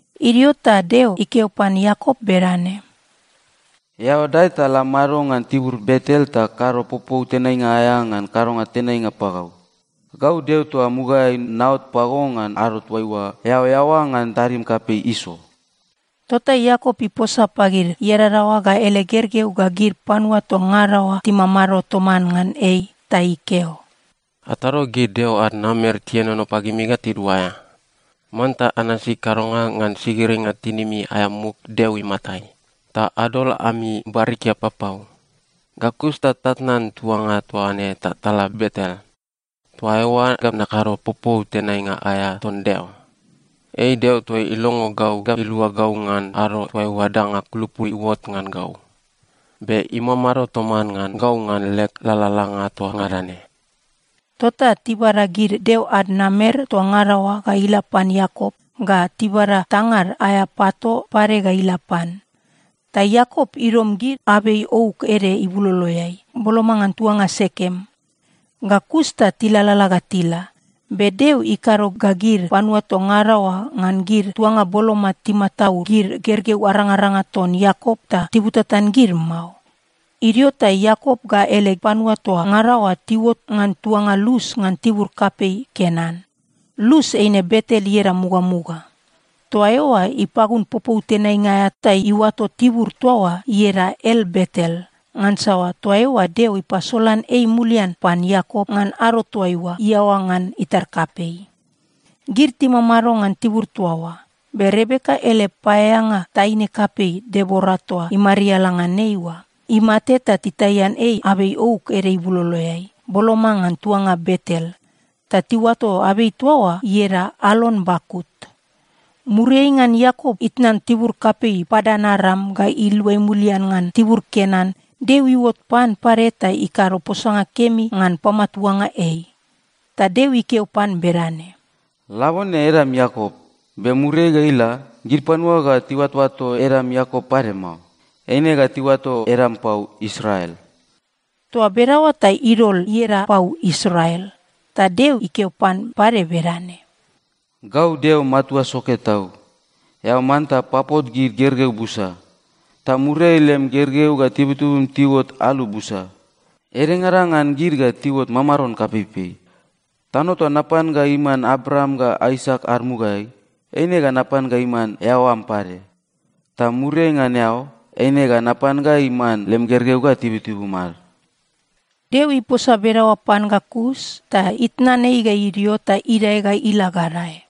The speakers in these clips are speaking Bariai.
Idio ta Deo ikeo pan Iakop bedane, “Eao dae ta la mado ngan tibur Betel ta kado popou tenainga aea ngan kadonga tenainga pagau. Gau Deo toa mugaeai naot pago ngan ado toaiua eao eaoa ngan tadim kapei Iso.” Tota Iakop iposa pagid iadadaoa ga ele gergeu ga gid panua toa ngada oa timamado toman ngan ei, ta ikeo, “Atado gid deo ad namer tienono pagimi ga tiduaea. Manta anasi kadonga ngan sigiringa tinimi aea muk Deo imatai. Ta adol ami barikia papau. Ga kus ta tatnan tuanga toa ne ta tala Betel. Toa eoa ga nakado popou tenainga aea ton Deo. Ei Deo toa ilongo gau ga ilua gau ngan ado toaiua danga kulupu iuot ngan gau. Be imamado toman ngan gau ngan leg lalalanga toa ngada ne.” Tota tibada gid deo ad namer toa ngada oa ga ila pan Iakop ga tibada tangad aea pato pade ga ila pan. Ta Iakop idom gid abei ouk ede ibuloloeai, boloma ngan tuanga Sekem. Ga kus ta tilalala ga tila, be Deo ikado ga gid panua toa ngada oa ngan gid tuanga boloma timataud gid gergeu arangaranga ton Iakop ta tibutatan gid mao. Idio ta Iakop ga ele panua toa ngada oa tiuot ngan tuanga Lus ngan tibur kapei Kenan. Lus eine Betel ieda mugamuga. Toa eoa ipagun popou tenainga aea ta iuato tibur toa oa ieda El-Betel ngansa toa eoa Deo ipasolan ei mulian pan Iakop ngan ado toaiua iaoa ngan itar kapei. Gid timamado ngan tibur toa oa, be Rebeka ele paeaeanga, taine kapei Debora toa imariala ngan ei oa, imate ta titaian ei abei ouk ede ibuloloeai, boloma ngan tuanga Betel. Ta tiuato abei toa oa ieda Alon-Bakut. Muriai ngan Iakop itnan tibur kapei Padan-Aram ga iluai mulian ngan tibur Kenan, Deo iuot pan pade ta ikado posanga kemi ngan pamatuanga ei. Ta Deo ikeo pan bedane, “Labone edam Iakop, be muriai ga ila, gid panua ga tiuatoato edam Iakop pade mao. Eine ga tiuato edam pau Israel.” Toa bedaoa ta idol ieda pau Israel. Ta Deo ikeo pan pade bedane, “Gau Deo Matua Soke Tau. Eao manta papot gid gergeu busa. Ta muriai lem gergeu ga tibutibum tiuot alu busa. Edengada ngan gid ga tiuot mamaron kapeipei. Tano toa napan ga iman Abraam ga Aisak ad mugaeai, eine ga napan ga iman eao am pade. Ta muriai ngan eao, eine ga napan ga iman lem gergeu ga tibutibum ad.” Deo iposa bedaoa pan ga kus ta itnan ei ga idio ta idae ga ila gadae.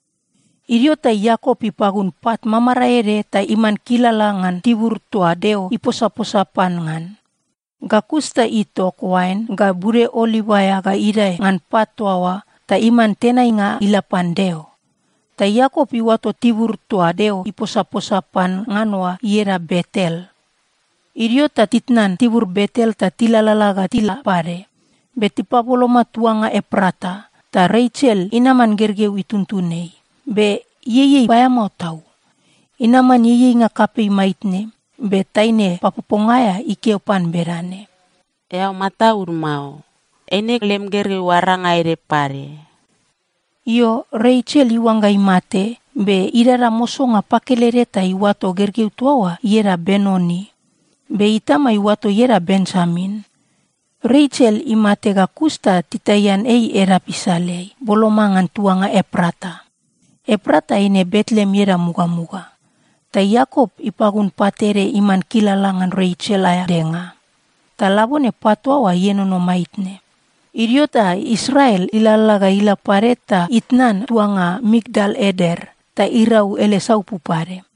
Idio ta Iakop ipagun pat mamarae ede ta iman kilala ngan tibur toa Deo iposaposa pan ngan. Ga kus ta itok oain ga bude oliv aea ga idae ngan pat toa oa ta iman tenainga ila pan Deo. Ta Iakop iuato tibur toa Deo iposaposa pan ngan oa ieda Betel. Idio ta titnan tibur Betel ta tilalala ga tila pade. Be tipaboloma tuanga Eprata, ta Resel inaman gergeu ituntun ei, be ieiei paeamao tau. Inaman ieieinga kapei maitne, be taine papoponga aea ikeo pan bedane, “Eao mataud mao. Eine lem gergeu aranga ede pade.” Io, Resel iuangga imate, be idada mosonga pakelede ta iuato gergeu toa oa ieda Benoni. Be itama iuato ieda Benjamin. Resel imate ga kus ta titaian ei edap isaleai, boloma ngan tuanga Eprata. (Eprata eine Betleem ieda mugamuga.) Ta Iakop ipagun pat ede iman kilala ngan Resel aea denga. Ta labone pat toa oa ienono maitne. Idio ta Israel ilalala ga ila pade ta itnan tuanga Migdal-Eder. Ta irau ele saupu pade.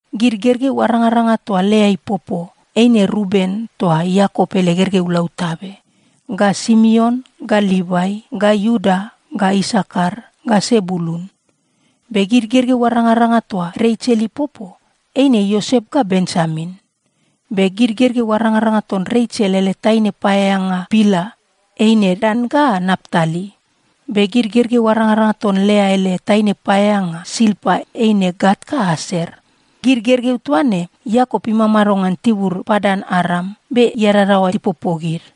Gid gergeu arangaranga toa Lea ipopo, eine Ruben toa Iakop ele gergeu lautabe, ga Simeon ga Livai ga Iuda ga Isakar ga Sebulun. Be gid gergeu arangaranga toa Resel ipopo, eine Iosep ga Benjamin. Be gid gergeu arangaranga ton Resel ele taine paeaeanga Bila eine Dan ga Naptali. Be gid gergeu arangaranga ton Lea ele taine paeaeanga Silpa eine Gat ga Aser. Gid gergeu toa ne, Iakop imamado ngan tibur Padan-Aram, be iadadaoa tipopo gid.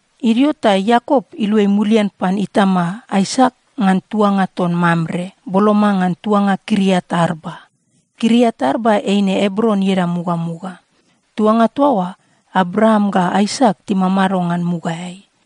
Idio ta Iakop iluai mulian pan itama Aisak ngan tuanga ton Mamre, boloma ngan tuanga Kiriat-Arba. (Kiriat-Arba eine Ebron ieda mugamuga.) Tuanga toa oa, Abraam ga Aisak timamado ngan mugaeai.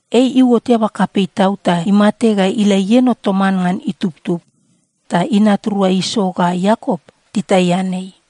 Ei iuot eaba kapei tau ta imate ga ila ieno toman ngan itubtub. Ta inat rua Iso ga Iakop titaian ei.